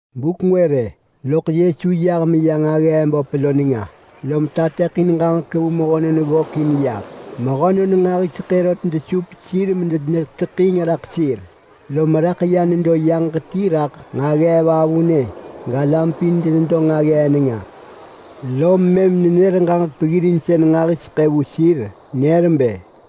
Buk ngwë rë, loḳ Yesu yah meya nġaggee böp lo nenga, lom tateḳin ġaġek vu mehönon ggökin yah. Mehönon nġahiseḳë rot desup sir medeneteḳing raḳ sir, lom raḳ ya nedo yaġ ti raḳ nġaggee vavunë galam pin denedo nġaggee nenga. Lom mëm nenër ġaġek peggirinsën nġahiseḳë vu sir, genër bë,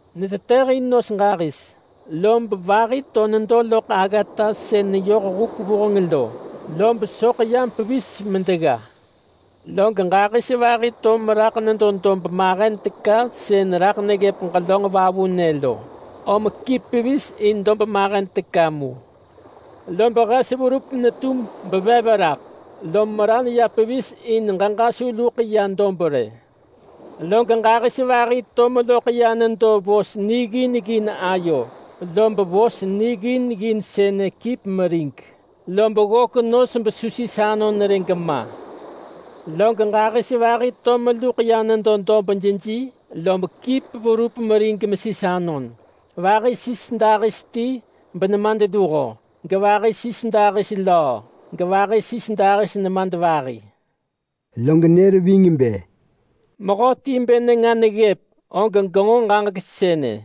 Netetëhin nos ġahis, lob vahi to nedo loḳ aggata sën neyoh huk vuheng lo, lob soḳ yam pevis medegga. Log ġahis vahi to meraḳ nedo dob mahen teka sën raḳ neggëp ġelönġ vavunë lo, om kip pevis in dob mahen teka mu. Lob hes verup netum bevev raḳ, lob meran ya pevis in ġeġa su luḳ ya dob rë. Log ġahis vahi to meloḳ ya nedo vos niggin ggin ayo, lob vos niggin ggin sënë kip merig, lob ggök nos besu sis anon rë gema. Log ġahis vahi to meluḳ ya nedo dob jeji lob kip verup merig mesis anon. Vahi sis dahis ti benemadluho, gevahi sis dahis löö, gevahi sis dahis nemadvahi.” Log nër ving bë, “Mehöti bë nenga neggëp, og genġo ġaġek sënë.”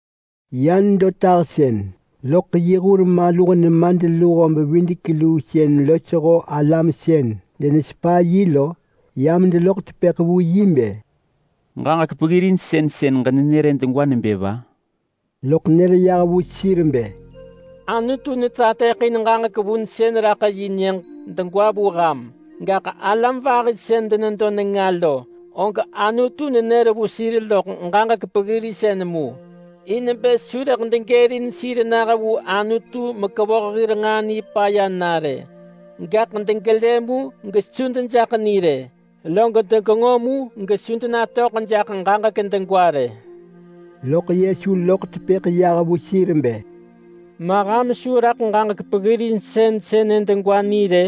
Ya nedo tahsën, loḳ yi hur maluh nemadluho-bevidek-luu sën losho alam sën denesepa yi lo, yam deloḳ tepëḳ vu yi bë, “Ġaġek peggirinsën sën ġenër-ë degwa nebë va?” Loḳ nër yah vu sir bë, “Anutu netateḳin ġaġek vunsën raḳ yi nyëġ degwa vu ham, gaḳ alam vahi sën denedo nenga lo, og Anutu nenër vu sir loḳ ġaġek peggirinsën mu, ‘in bë su rëḳ degërin sir nah vu Anutu mekevoh hir nġaa nipaya na rë. Gaḳ degelë mu gesu dejaḳ ni rë, log degenġo mu gesu denatöḳ jaḳ ġaġek degwa rë.’” Lob loḳ tepëḳ yah vu sir nebë, “Ma ham su raḳ ġaġek peggirinsën sënë degwa ni rë?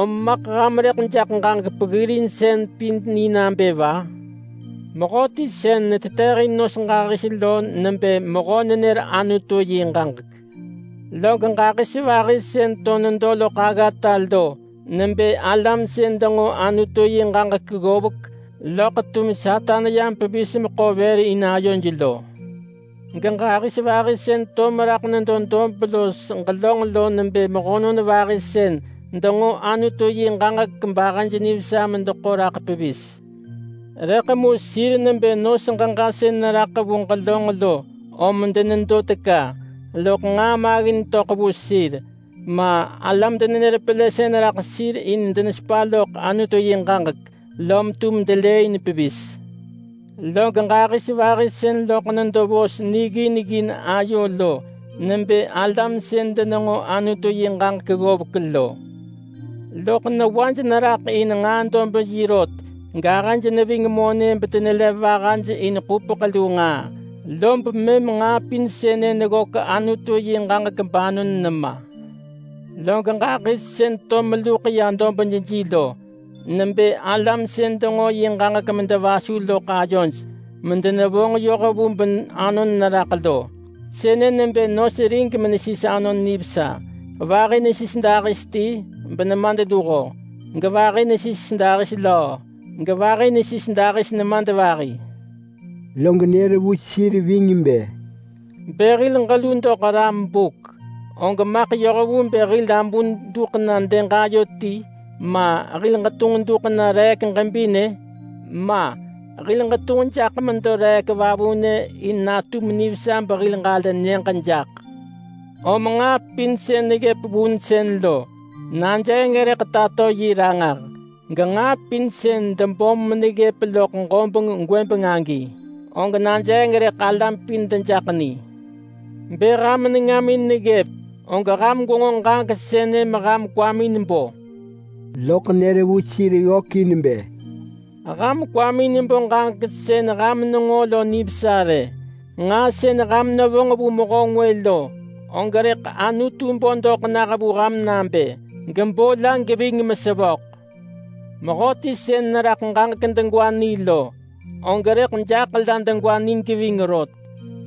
Om maḳ ham rëḳ jaḳ ġaġek peggirinsën pin ni nabë va? Mehöti sën netetëhin nos ġahis lo nebë mehö nenër Anutu yi ġaġek. Log ġahis vahi sën to nedo loḳ aggata lo nebë alam sën denġo Anutu yi ġaġek ggovek, loḳ tum Satan yam pevis meḳo vër in ayoj lo. Geġahis vahi sën to meraḳ nedo dob los ġelönġ lo nebë mehönon vahi sën denġo Anutu yi ġaġek log ahëj nivesa medeḳo raḳ pevis. Rëḳ mu sir nebë nos ġeġa sën neraḳ vu ġelönġ lo om denedo teka, loḳ nġaa maggin töḳ vu sir, ma, alam denenër pelësën raḳ sir in denesepa loḳ Anutu yi ġaġek, lom tum delëëin pevis. Log ġahis vahi sën loḳ nedo vos niggin ggin ayo lo nebë alam sën denenġo Anutu yi ġaġek ggovek lo. Loḳ newaj neraḳ in nġaa-dob-yi rot gahëj neving monë bedenelev vahaj in ḳupeḳ lu nġaa, lob mëm nġaa pin sënë neggök Anutu yi ġaġek banon nema. Log ġahis sën to meluḳ ya dob jeji lo nebë alam sën denġo yi ġaġek medevasu loḳ ayoj medenevonġ yoh vu banon neraḳ lo. Sënë nebë nos rig menesis anon nivesa; vahi nesis dahis ti benemadluho, gevahi nesis dahis löö, gevahi nesis dahis nemadvahi.” Lob nër vu sir bë, “Bë hil ġelu doḳ ram buk, og maḳ yoh vu bë hil abun duḳ na dëg ayo ti, ma, hil ġetunġ duḳ na reek ġebinë? Ma! Hil ġetunġ jaḳ medo reek vavunë in natum nivesa behil ġalë nyëġ jaḳ. Lob nġaa pin sën neggëp vunsën lo, najeeng rëḳ tato yi ranġah, genġaa pin sën debom meneggëp loḳ ġobeng gwëbeng agi, og najeeng rëḳ alam pin dejaḳ ni. Bë ham nengamin neggëp, og ham gwenġo ġaġek sënë meham kwamin bo!” Loḳ nër vu sir ggökin bë, “Ham kwamin bo ġaġek sën ham nenġo lo nivesa rë. Nġaa sën ham nevonġ vu mehö ngwë lo, og rëḳ Anutu bo doḳ nah vu ham nabë, gebo la geving mesevöḳ. Mehöti sën neraḳ ġaġek degwa ni lo, og rëḳ jaḳ la degwa ni geving rot.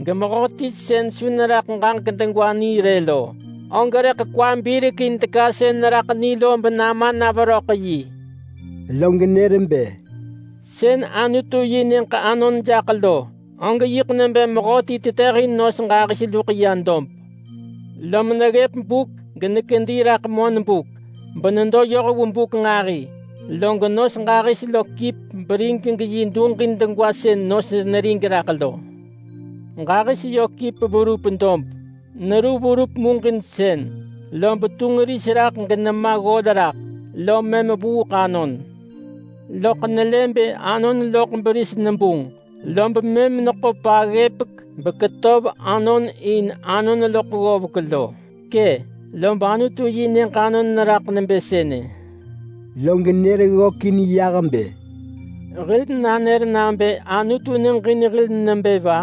Gemehöti sën su neraḳ ġaġek degwa ni rë lo, og rëḳ kwa birekin teka sën neraḳ ni lo benama na veröḳ yi.” Log nër bë, “Sën Anutu yi Nyëġ anon jaḳ lo, og yiḳ nebë mehöti tetëhin nos ġahis luḳ ya dob. Lom neggëp buk genekedi raḳ monbuk benedo yoh vu buk nġahi, log nos ġahis lo kip berig geyi duġin degwa sën nos nerig raḳ lo. Ġahis yö kip verup dob. Neru verup muġinsën, lob tunġ ris raḳ genema ggol raḳ, lom mëm vuuḳ anon. Loḳ nelë bë anon loḳ beris nebunġ, lob mëm neḳo paggëpek beketöv anon in anon loḳ ggovek lo. Kë! Lob Anutu yi Nyëġ anon neraḳ nebë sënë.” Log nër ggökin yah bë, “Hil nanër nabë Anutu neġin hil nebë va?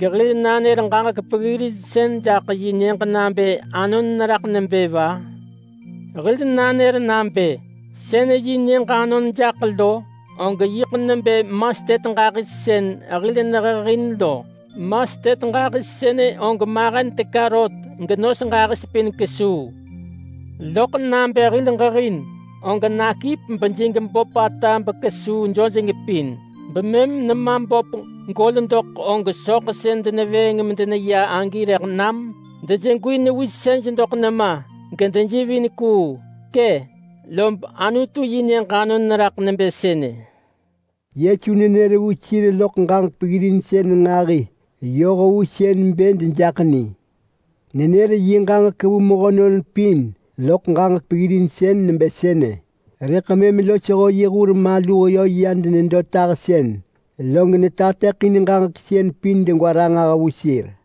Gehil nanër ġaġek peggirinsën jaḳ yi nyëġ nabë anon neraḳ nebë va? Hil nanër nabë: Sën yi Nyëġ anon jaḳ lo, og yiḳ nebë mastet ġahis sën hil nehehin lo. Mastet ġahis sënë og mahen teka rot genos ġahis pin kesuu. Loḳ nabë hil ġehin, og nakip bejig böpata bekesuu jojeng pin, bemëm nema böp gol doḳ og soḳ sën denevëëng medeneya agi rëḳ nam dejegwi newisej doḳ nema gedejivin kuu. Kë! Lob Anutu yi Nyëġ anon neraḳ nebë sënë!” Yesu nenër vu sir loḳ ġaġek peggirinsën nġahi yoh vu sën bë dejaḳ ni. Nenër yi ġaġek vu mehönon pin loḳ ġaġek peggirinsën nebë sënë, rëḳ mëm losho yi hur maluh yö ya denedo tahsën, log netateḳin ġaġek sën pin ranġah vu sir.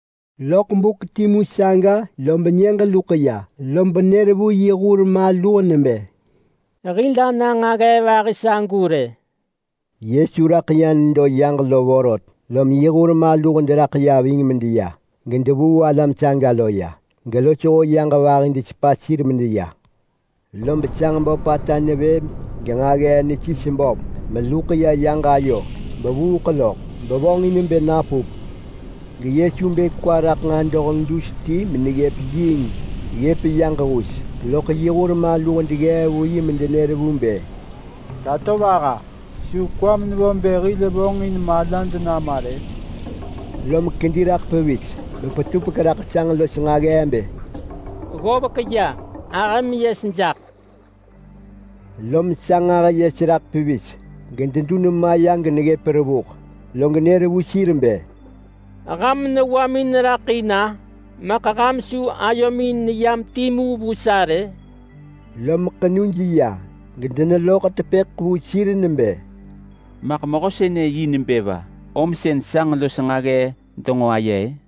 Loḳ buk timu saga, lob nyëġ luḳ ya, lob nër vu yi hur maluh nebë, “Hil ana nġaggee vahi sagu rë.” Yesu raḳ nedo yaġ lo vorot, lom yi hur maluh deraḳ ya ving medeya, gedevuu alam saga lo ya. Gelosho yaġ vahi desepa sir medeya. Lob sanġ böpata nevë genġaggee nesis böp meneluḳ ya yaġ ayo bevuuḳ loḳ, bevonġin bë napup. GeYesu bë kwa raḳ nġadoheng dus ti meneggëp yiing ggëp yaġ hus, loḳ mëm yi hur maluh deggee vu yi medenër vu bë, “Tatovaha! Su kwam nevo hil bë vonġin hil malad nama rë?” Lom kedi raḳ pevis bepetupek raḳ sanġ los nġaggee bë, “Ggovek ya! Ahëm yes jaḳ!” Lom sanġ ahë yes raḳ pevis gededun ma geneggëp. Lob mëm nër vu sir bë, “Ham newamin raḳ in-a? Maḳ su ham ayomin neyam timu vu sa rë?” Lom ḳenuj ya rot gedeneloḳ tepëḳ vu sir nebë, “Maḳ mehö sënë yi nebë va? Om sën sanġ los nġaggee denġo aye-ë?”